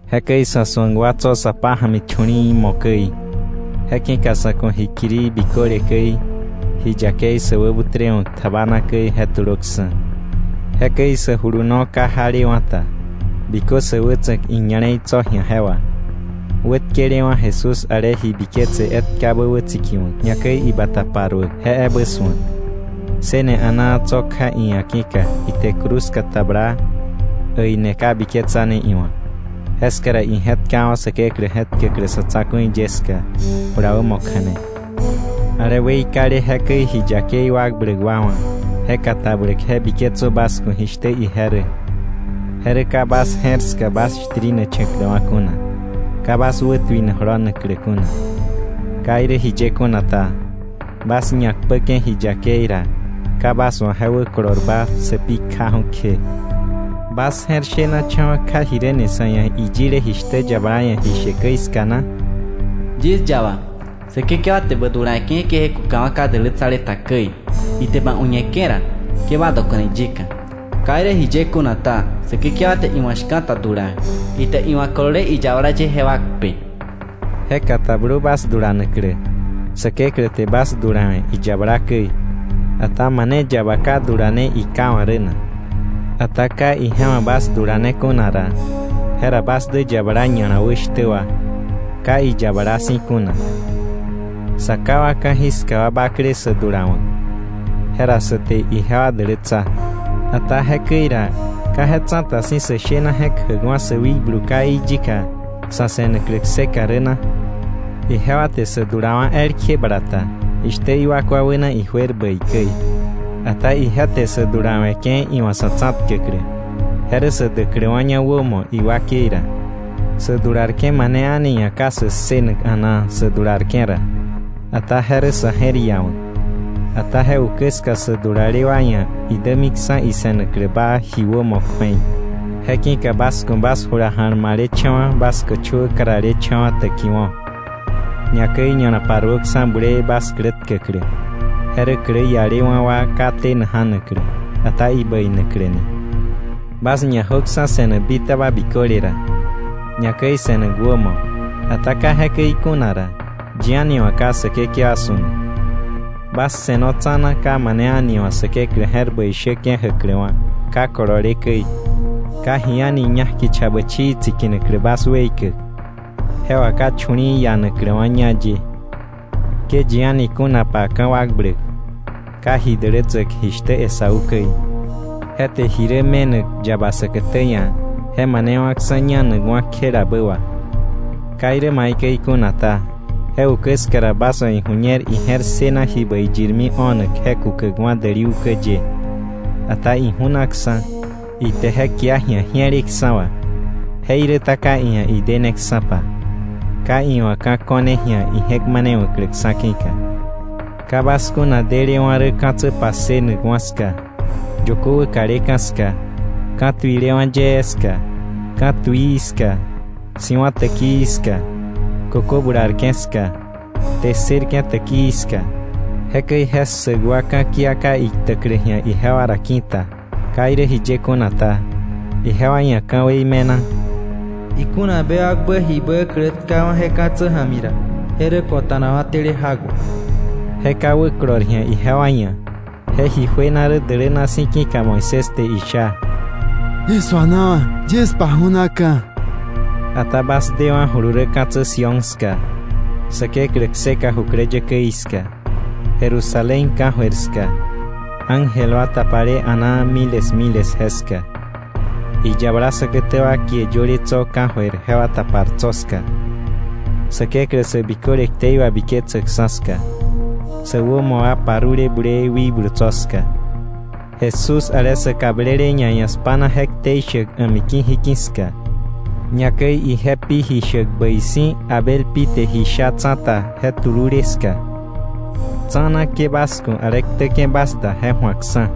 Jekäi sa̱ su̱ak wa tso̱ sa pája̱mi chu̱li̱i̱ mo̱ käi, je ki̱ka sa̱ ku̱ ji kirii biköle käi, ji yakei sä wäbutrewa̱k tjabana käi je tulöksa̱. Jekäi sä juluno ka jalewa̱ ta, bikö sä wätsa̱k iña̱le̱i tso̱ ji̱a je wà, wä tkelewa̱ Jesús ale ji biketse etkabä wätsikiwa̱k, ñakäi ibata paruäk, je ebä su̱ak. Ssëne a̱naa tso̱ kja iia̱ ki̱ka ite cruz katabla, äine ka biketsane iwa̱. Jeska ra ije̱tkawa̱ Säkeklä je̱tkäklä sa̱ tsa̱ku̱i ye ska, jula wämo kja̱ne. Ale weikale jekäi ji yakei wakbläk wa wa̱ je katabläk je biketsö bas ku̱ jishtä ije rä, je rä ka bas je̱r ska bas shtirinacha̱kläwa̱ kuna, ka bas wätuina jolonaklä kuna. Ka irä jiye kuna ta, bas ñakpäke̱ ji yakei ra, ka bas wa̱ je wäkolorba sä pi kjaju̱ kje. ¿Bas je̱r shenacha̱wa̱ kja jiräni sa̱ ia̱ iyile jishtä yabala ia̱ ji she käi ska na? “Yis yaba, Säkekewa te bä dulawe̱ke̱, ke je kukawa̱ ka dälätsale ta käi, ite ba uñeke̱ ra, ke ba dokona iyika. Ka irä jiye kuna ta, Säkekewa te iwa̱ shka̱ta dulawe̱, ite iwa̱ kolole iyabala ye jewa kpe.” Je katablö bas dulanaklä. Säkeklä te bas dulawe̱ iyabala käi. Ata ¿mane yaba ka dulane iká wa̱ rä na? Ata ka ije wa̱ bas dulane kuna ra, jera bas dä yabala ña̱la wä shtä wa, ka iyabala si̱ kuna. Sa ká wa ka̱jiska wa bakle sä dulawa̱k, jera sä te ijewa dälätsa. Ata jekäi ra, ¿ka je tsa̱ta si̱ sä shena je̱k jäwa̱ sä wikblu káí yika, sa̱ se̱naklä kseka rä na? Ijewa te sä dulawa̱ elkje bala ta, jishtä iwakwa wäna ijuer bäi käi, ata ije te sä dulawe̱ke̱ iwa̱ sa̱ tsa̱tkäklä, je rä sä däkläwa̱ña wämo iwakei ra. Sä dularke̱ mane a̱ni ia̱ ka sä ssënak a̱naa sä dularke̱ ra, ata je rä sa̱ je̱r iawa̱k. Ata je ukä ska sä dulale wa ia̱ idämiksa̱ issënaklä baa ji wämo kju̱ei. Je ki̱ka bas ku̱ bas jula ja̱lmalecha̱wa̱, bas köchöwä karalecha̱wa̱ täkiwo̱, ñakäi ña̱la paruöksa̱ bulee bas klä tkäklä, je rä klä ialewa̱ wa ka tena ja̱naklä, ata ibäinakläni. Bas ñajöksa̱ se̱nak bitaba biköle ra, ñakäi se̱nak wämo, ata ka jekäi kuna ra, yi a̱ni wa̱ ka Säkekewa su̱nak. Bas se̱no tsa̱na, ka mane a̱ni wa̱ Säkeklä je̱r bäi shäke̱ jäkläwa̱ ka kolole käi, ka ji a̱ni ñak kicha bächii tsikinaklä bas weikäk, je wà ka chu̱li̱i̱ ianakläwa̱ ñá ye. Ke yi a̱ni kunapa ka̱wakbläk, ka ji dälätsäk jishtä Esaú käi. Je te ji rä me̱nak yaba säkätä ia̱ je manewa̱ksa̱ ñanakwa̱ kjelabä wà̱. Ka irä maikäi kuna ta, je ukä ska ra bas wa̱ iju̱ñer ije̱r ssëna ji bäi yirmi o̱nak je kukäkwa̱ däli ukä ye, ata iju̱naksa̱. Ite je kia ji̱a ji̱eleksa̱ wà, jeiräta ka iia̱ ideneksa̱pa, ka iwa̱ ka̱ ko̱ne ji̱a ije̱k manewa̱kläksa̱ ki̱ka. Ka bas kuna delewa̱ rä ka̱tsä passënakwa̱ ska, yökö wäkaleka̱ ska, ka̱tuilewa̱ yee ska, ka̱ tuii ska, si̱wa̱ täkii ska, kökö bularke̱ ska, kte ssërke̱ täkii ska. Jekäi je ssäk wa ka̱kia ka iktäklä ji̱a ijewa ra ki̱ta. Ka irä jiye kuna ta, ijewa ia̱ ka̱wei me̱na: “Ikuna bewakbä jibä klä tkawa̱ je ka̱tsä ja̱mi ra, je rä kota̱nakwa̱ tele jak wà.” Je ka wäkolor ji̱a ijewa ia̱. Je ji juena rä däläna si̱, ki̱ka Moisés te isha: “Yis suanawa̱, yis paju̱naka̱.” Ata bas dewa̱julu rä ka̱tsä Sión ska, Säkeklä kseka jukläyäkäí ska, Jerusalén ka̱jöir ska, ángel wa tapale a̱naa miles miles jeska, iyabala säkätä wa kie yöle tso̱ ka̱jöir jewa tapar tso̱ ska, Säkeklä sä biköle ktei wabiketsäkksa̱ ska, sä wämo wa parule bulee wikblu tso̱ ska, Jesús ale sa kablele ñaia̱ spa̱na je ktei shäk a̱miki̱ jiki̱ ska, ñakäi ije pi ji shäk bäi si̱ Abel pi te ji sha tsa̱ta, je tulule ska. Tsa̱na, ke bas ku̱ ale ktäke̱ bas da je ju̱akksa̱.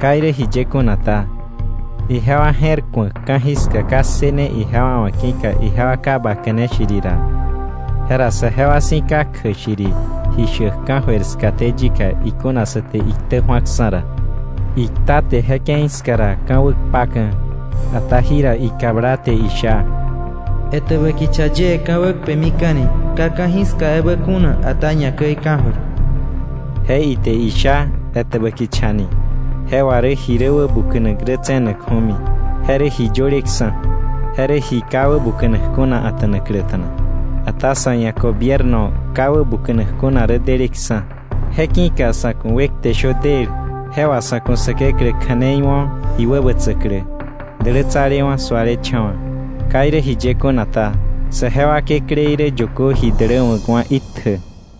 Ka irä jiye kuna ta, ijewa je̱r ku̱ak ka̱jiska ka ssëne ijewa wa̱ ki̱ka ijewa ka baka̱ne shiri ra, jera saje wa si̱ ka kjäk shiri ji shäk ka̱jöir skaté yika ikuna sa te iktä ju̱aksa̱ ra. Ikta te je ke̱i ska ra ka̱ wäkpaka̱, ata jira ikabla, te isha: “Etäbä kicha yie ka̱ wäkpemika̱ni, ka ka̱jiska ebä kuna, ata ñakäi ka̱jöir.” Je ite sha: “Etäbä kichani,” je wà rä ji rä wäbuka̱nak rä tse̱nakju̱mi, je rä ji yöleksa̱. Je rä ji ka wäbuka̱nak kuna a̱ta̱nakläta̱na. Ata sa̱ ia̱ gobierno ka wäbuka̱nak kuna rä deleksa̱. Je ki̱ka sa̱ ku̱ wekte shö del, je wà sa̱ ku̱ Säkeklä kja̱nei wo̱ iwäbätsäklä, dälätsalewa̱ sualecha̱wa̱. Ka irä jiye kuna ta, saje wa kekläí rä yökö ji däläwa̱kwa̱ itjä.